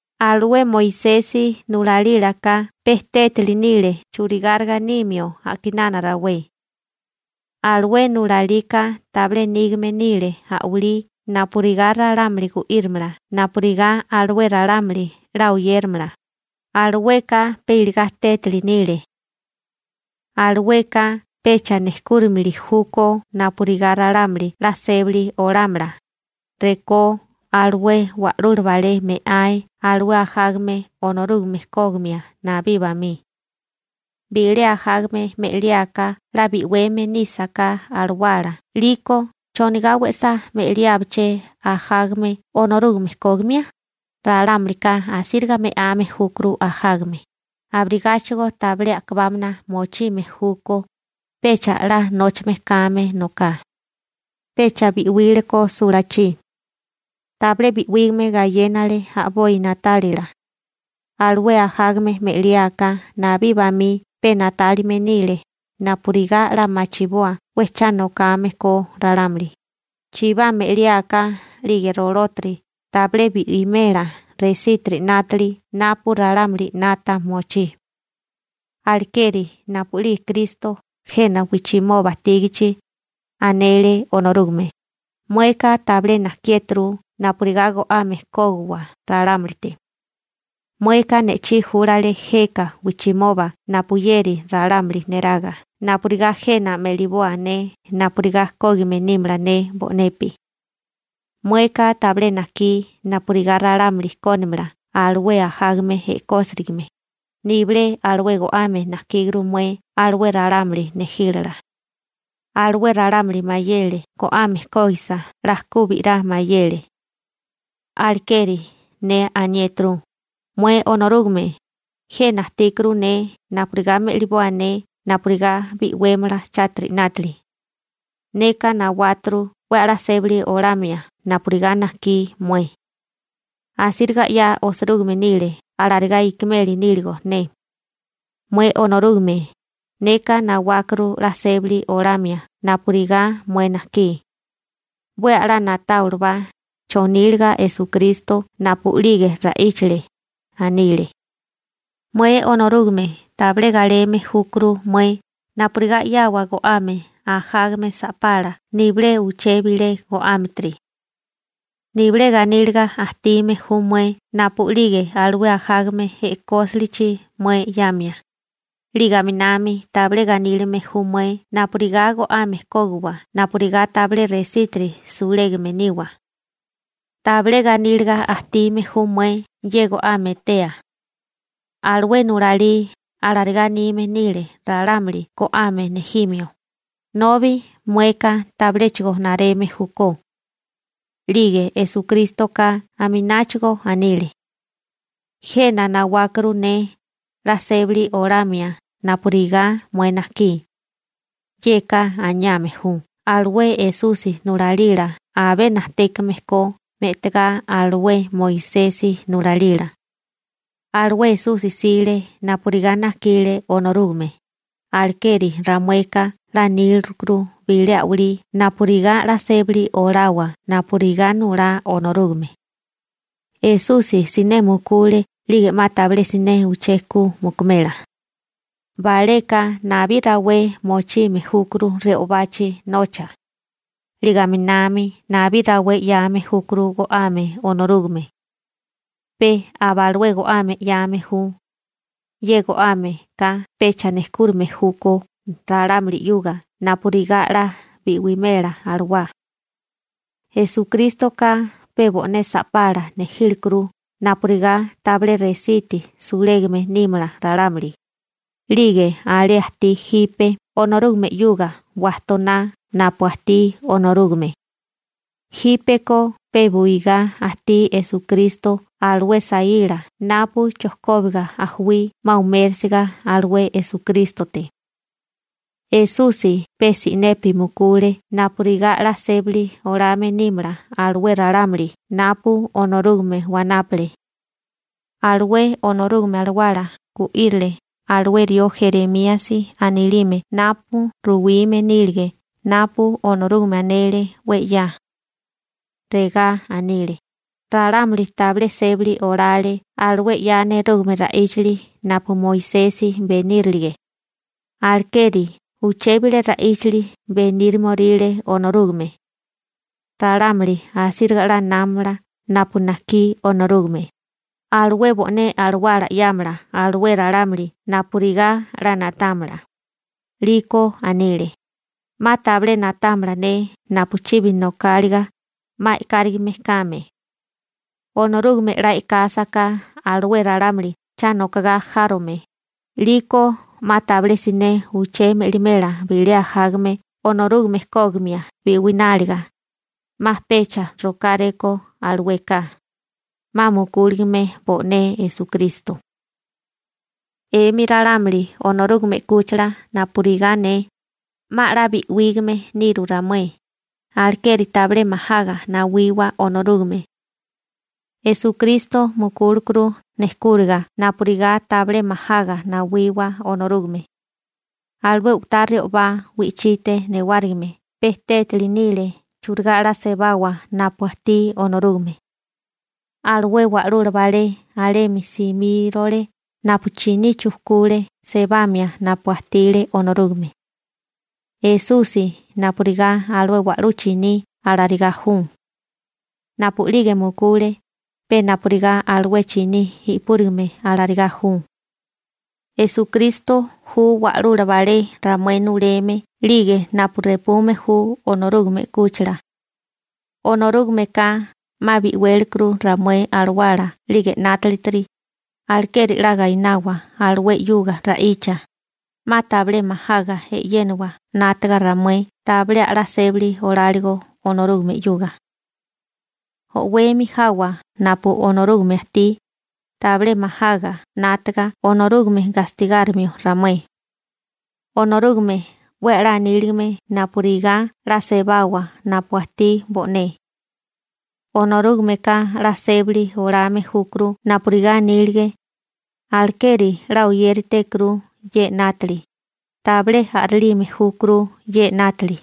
Alué Moisesi nulalílaka pe tétali nile churigáriga nimio a'kinana rawé. Alué nulalika tabilé nígame nile a'walí napurigá ralámuli gu'írimala napurigá alué ralámuli 'la oyéramala, alueka pe iligá tétali nile. Alueka pecha nejkúrimili júkó napurigá ralámuli 'la sébali olámala, rekó alué wa'lula balé me'ae alué ajágame Onorúgame kógimia nabí bamí. Bilé ajágame me'liáká 'la bi'weme nísaká alawala 'liko, ¿chonigá we'sá me'liábiché ajágame Onorúgame kógimia? Ralámulika asíriga me'ame júkuru ajágame, abirigáchigo tabilé a'kabámana mochime júkó, pecha 'la nóchame kame noká. Pecha bi'wílekó sulachí. Tabilé bi'wígame gayénale a'boi na'talia. Alué ajágame me'liáká nabí bamí pe na'tálime nile napurigá 'la machiboa 'we cha nokame ko ralámuli. Chibá me'liáká 'lige rolótiri tabilé bi'imela resítiri 'nátili napu ralámuli 'nata mochí. Alekeri napu'lige Kristo jena wijchimoba ajtígichi, anele Onorúgame: Mueka tabilé najkiéturu napurigá go'ame kógiwa ralámulite. Mueka ne'chí júlale jeka wijchimoba napuyeri ralámuli neraga napurigá jena me'liboa ne napurigá kógime nímala ne bo'nepi. Mueka tabilé najkí napurigá ralámuli kónimala alué ajágame e'kósirigame, nibilé alué go'ame najkíguru mué alué ralámuli nejílala. Alué ralámuli mayele go'ame kógisa 'la ku bi'rá mayele. Alekeri ne aniéturu: «Mué Onorúgame, jena ajtíkuru ne napurigá me'liboa ne napurigá bi'wémala chátiri 'nátili. Neka nawáturu 'we a'lá sébali olamia napurigá najkí mué. Asíriga 'ya osirúgime nile alarigá ikimeli níligo ne. Mué Onorúgame, neka nawákuru 'la sébali olamia napurigá mué najkí.» 'We a'lá na'táwabala choníliga Esukristo napu'lige ra'íchale, anile: «Mué Onorúgame tabilé galeme júkuru mué napurigá 'yawa go'ame ajágame sa'pala nibilé uché bilé go'ámetiri. Nibilé ganíliga ajtime ju mué napu'lige alué ajágame e'kósilichi mué 'yamia, 'lige aminami tabilé ganílime ju mué napurigá go'ame kógiwa napurigá tabilé resítiri sulégame niwa. Tabilé ganíliga ajtime ju mué ye go'ame etea. Alué nulalí alarigá anime nile ralámuli go'ame nejimio, nobi mueka tabiléchigo nareme júkó.» 'Lige Esukrístoka amináchigo anile: «Jena nawákuru ne 'la sébali olamia napurigá mué najkí.» Yeka aniame ju alué Esusi nulalila abé najtékame ko me'tagá alué Moisesi nulalila. Alué Esusi 'sile napurigá najkile Onorúgame, alekeri ramueka 'la nílirukuru bilé a'walí napurigá 'la sébali olawa napurigá nulá Onorúgame. Esusi siné mukule 'lige 'ma tabilé siné uché mukumela. Baleka nabí rawé mochime júkuru re'obachi nocha, 'lige aminami nabí rawé 'yame júkuru go'ame Onorúgame, pe aba alué go'ame 'yame ju. Ye go'ámeka pecha nejkúrame júkó ralámuli 'yuga napurigá 'la bi'wémela alawá. Esukrístoka pe bo'né sa'pala nejílekuru napurigá tabilé resiti sulégame nímala ralámuli, 'lige alé ajtí jipe Onorúgame 'yuga wajtoná napu ajtí Onorúgame. Jípeko pe buigá ajtí Esukristo alué saíla napu chojkóbiga ajuí 'ma umérisiga alué Esukrístote. Esusi pe si'nepi mukule napurigá 'la sébali olame nímala alué ralámuli napu Onorúgame wanápale. Alué Onorúgame Alawala gu'írile alué rió Jeremíasi anilime napu ruwime nílige napu Onorúgame anele 'we 'ya. Regá anile: Ralámuli tabilé sébali olale alué 'ya nerúgame ra'íchali napu Moisesi benírilige. Alekeri uché bilé ra'íchali benírimoríle Onorúgame. Ralámuli asíriga 'la námala napu najkí Onorúgame, alué bo'né alawala 'yámala alué ralámuli napurigá 'la na'támala. 'Liko anile: 'Ma tabilé na'támala ne napu chibi nokáliga, 'ma e'kárigime kame. Onorúgame 'la e'kásaká alué ralámuli cha nokogá járome, 'liko 'ma tabilé siné uché me'limela bilé ajágame Onorúgame kógimia bi'wináliga, 'ma pecha rokáréko alueka, 'ma mukúligame bo'né Esukristo. 'Emi ralámuli Onorúgame 'kúchila napurigá ne, 'ma 'la bi'wígame niru ramué, alekeri tabilé majaga nawiwa Onorúgame. Esukrísto mukúlekuru nejkúriga napurigá tabilé majaga nawiwa Onorúgame. Alué u'tá re'obá wi'chite newárigime pe tétali nile churigá 'la sebawa napu ajtí Onorúgame. Alué wa'lula balé alemi simírole napu chiní chujkule sebamia napu ajtile Onorúgame. Esusi napurigá alué wa'lú chiní alarigá ju. Napu'lige mukule, pe napurigá alué chiní i'púrigame alarigá ju. Esukristo ju wa'lula balé ramué nuleme 'lige napu repume ju Onorúgame 'kúchila. Onorúgameka 'ma bi'wélikuru ramué alawala 'lige 'nátilitiri, alekeri 'la gainawa alué 'yuga ra'icha, 'ma tabilé majaga e'yénawa 'nátaga ramué tabilé a'lá sébali oláligo Onorúgame 'yuga. O'wemi jawa napu Onorúgame ajtí, tabilé majaga 'nátaga Onorúgame gastigárimio ramué. Onorúgame 'we a'lá aníligame napurigá 'la sebawa napu ajtí bo'né. Onorúgameka 'la sébali olame júkuru napurigá anílige. Alekeri 'la oyéritékuru ye 'nátili, tabilé a'rélime júkuru ye 'nátili.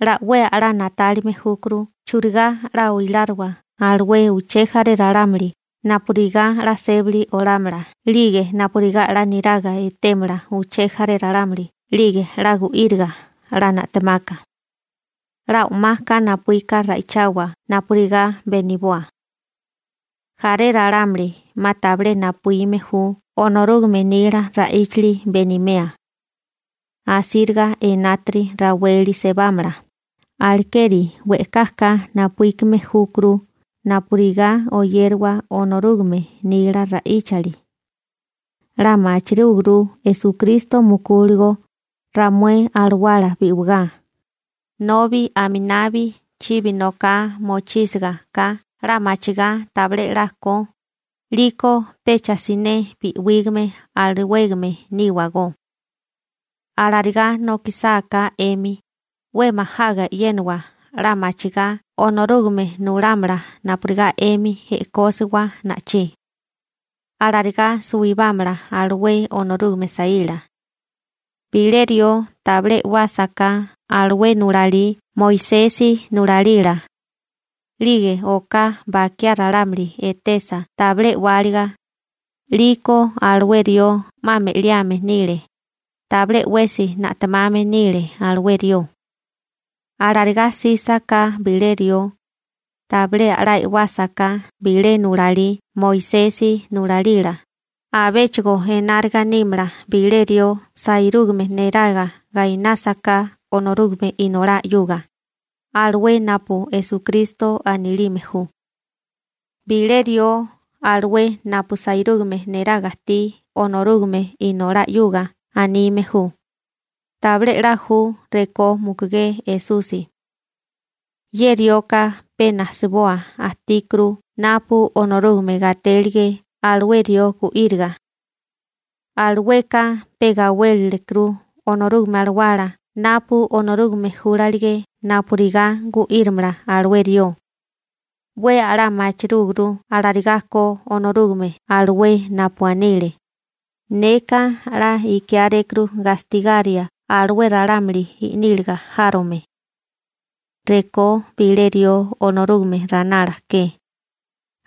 'La 'we a'lá na'tálime júkuru churigá 'la oiláriwa alué uché jaré ralámuli napurigá 'la sébali olámala 'lige napurigá 'la niraga etémala uché jaré ralámuli 'lige 'la gu'íriga 'la na'temaka. 'La o'maka napuíka ra'ichawa napurigá beniboa. Jaré ralámuli 'ma tabilé napuíme ju Onorúgame nila ra'íchali benimea. Asíriga enátiri raweli sebámala, alekeri we'kaka napuíkime júkuru napurigá oyériwa Onorúgame nila ra'íchali. 'La machirúguru Esukristo mukúligo ramué alawala bi'wigá, nobi aminabi chibi noká mochísiga ka 'la machigá tabilé 'la ko, 'liko pecha si'né bi'wígame alawégame níwagó. Alarigá nokísasaká 'emi, 'we majaga e'yénawa 'la machigá Onorúgame nulámala napurigá 'emi e'kósiwa na'ichí. Alarigá suwibámala alué Onorúgame saíla. Bilé rió tabilé e'wásaká alué nulalí Moisesi nulalila, 'lige oká bakiá ralámuli etesa tabilé e'wáliga, 'liko alué rió 'ma me'liame nile, tabilé 'wesi na'temame nile alué rió. Alarigá 'sísaká bilé rió, tabilé a'lá e'wásaká bilé nulalí Moisesi nulalila, abéchigo enáriga nímala bilé rió sairúgame neraga gainásaká Onorúgame Inolá 'yuga, alué napu Esukristo anilime ju. Bilé rió alué napu sairúgame neraga ajtí Onorúgame Inolá 'yuga anime ju: «Tabilé 'la ju rekó mukugé Esusi.» Ye rioka pe najsabua ajtíkuru napu Onorúgame gatélige alué rió gu'íriga. Alueka pe gawélilekuru Onorúgame Alawala napu Onorúgame júlalige napurigá gu'írimala alué rió. 'We a'lá machirúguru alarigá ko Onorúgame alué napu anile: «Neka 'la ikiárékuru gastigaria alué ralámuli i'níliga járome. Rekó bilé rió Onorúgame ranala ke,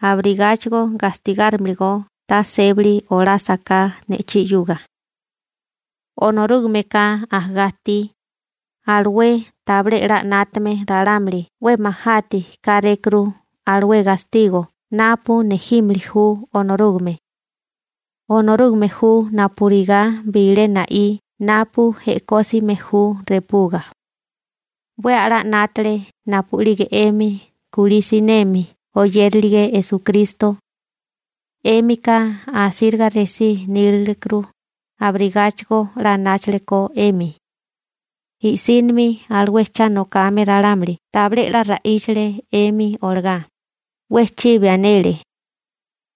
abirigáchigo gastigárimalagó ta sébali olásaká ne'chí 'yuga.» Onorúgameka ajagá ajtí, alué tabilé 'la 'nátame ralámuli 'we majáati kárékuru alué gastigo napu nejímili ju Onorúgame. Onorúgame ju napurigá bilé na'í napu e'kósime ju repuga. 'We a'lá 'nátale napu'lige 'emi kulí sinemi oyérilige Esukristo. 'Émika asíriga resí nílilekuru, abirigáchigo 'la anáchalekó 'emi. I'sínimi alué cha nokame ralámuli tabilé 'la ra'íchale 'emi olagá, 'we chibi anele.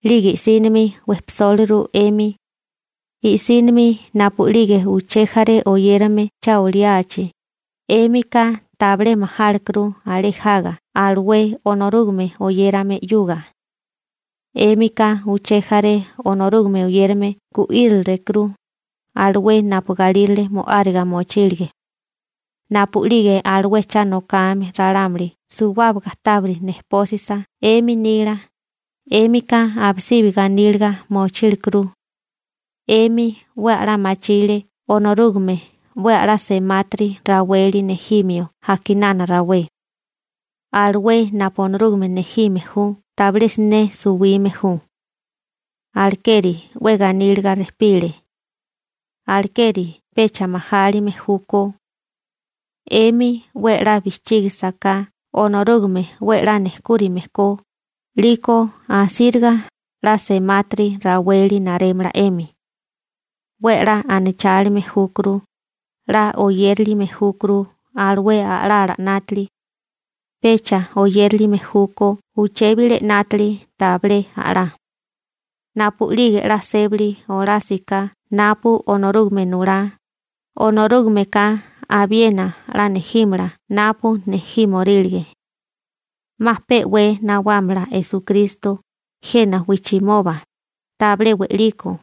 'Lige i'sínimi wejpisóliru 'emi. I'sínimi napu'lige uché jaré oyérame cha oliachi, 'émika tabilé majálekuru alé jaga alué Onorúgame oyérame 'yuga. 'Émika uché jaré Onorúgame oyérame gu'írilekuru, alué napu galírale mo'áriga mochílige. Napu'lige alué cha nokame ralámuli suwábaga tábiri nejpósisa 'emi nila, 'émika abisibi ganíliga mochílekuru. 'Emi 'we a'lá machile Onorúgame 'we a'lá semátiri raweli nejimio a'kinana rawé. Alué napu Onorúgame nejime ju tabilé siné suwime ju. Alekeri 'we ganíliga rejpile. Alekeri pecha majálime júkó. 'Emi 'we 'la bijchígisiká Onorúgame 'we 'la nejkúrime ko, 'liko asíriga 'la semátiri raweli narémala 'emi. 'We 'la anachálime júkuru. 'La oyérilime júkuru alué a'lala 'nátili. Pecha oyérilime júkó uché bilé 'nátili tabilé a'lá. Napu'lige 'la sébali olásiká napu Onorúgame nulá, Onorúgameka abiena 'la nejímala napu nejímorílige. 'Ma pe'wé nawámala Esukristo jena wijchimoba, tabilé we'liko.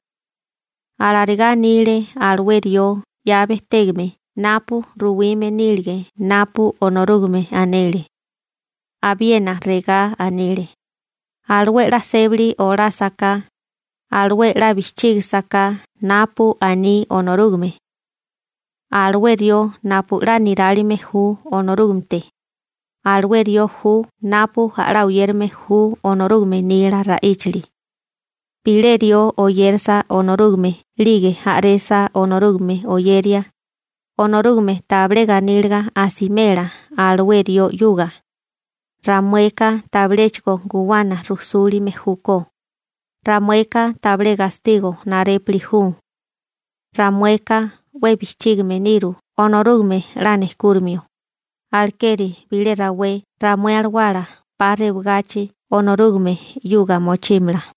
Alarigá anile alué rió 'ya bejtégame napu ruwime nílige napu Onorúgame anele. Abiena regá anile: Alué 'la sébali olásaká, alué 'la bijchígisaká napu aní Onorúgame. Alué rió napu 'la nirálime ju Onorúgamete, alué rió ju napu a'lá oyérame ju Onorúgame nila ra'íchali. Bilé rió oyérasa Onorúgame 'lige a'resa Onorúgame oyeria, Onorúgame tabilé ganíliga asimela alué rió 'yuga. Ramueka tabiléchigo guwana rujsúlime júkó, ramueka tabilé gastigo narépuli ju. Ramueka 'we bijchígime niru Onorúgame 'la nejkúrimio, alekeri bilé rawé ramué alawala 'pa rewagachi Onorúgame 'yuga mochímala.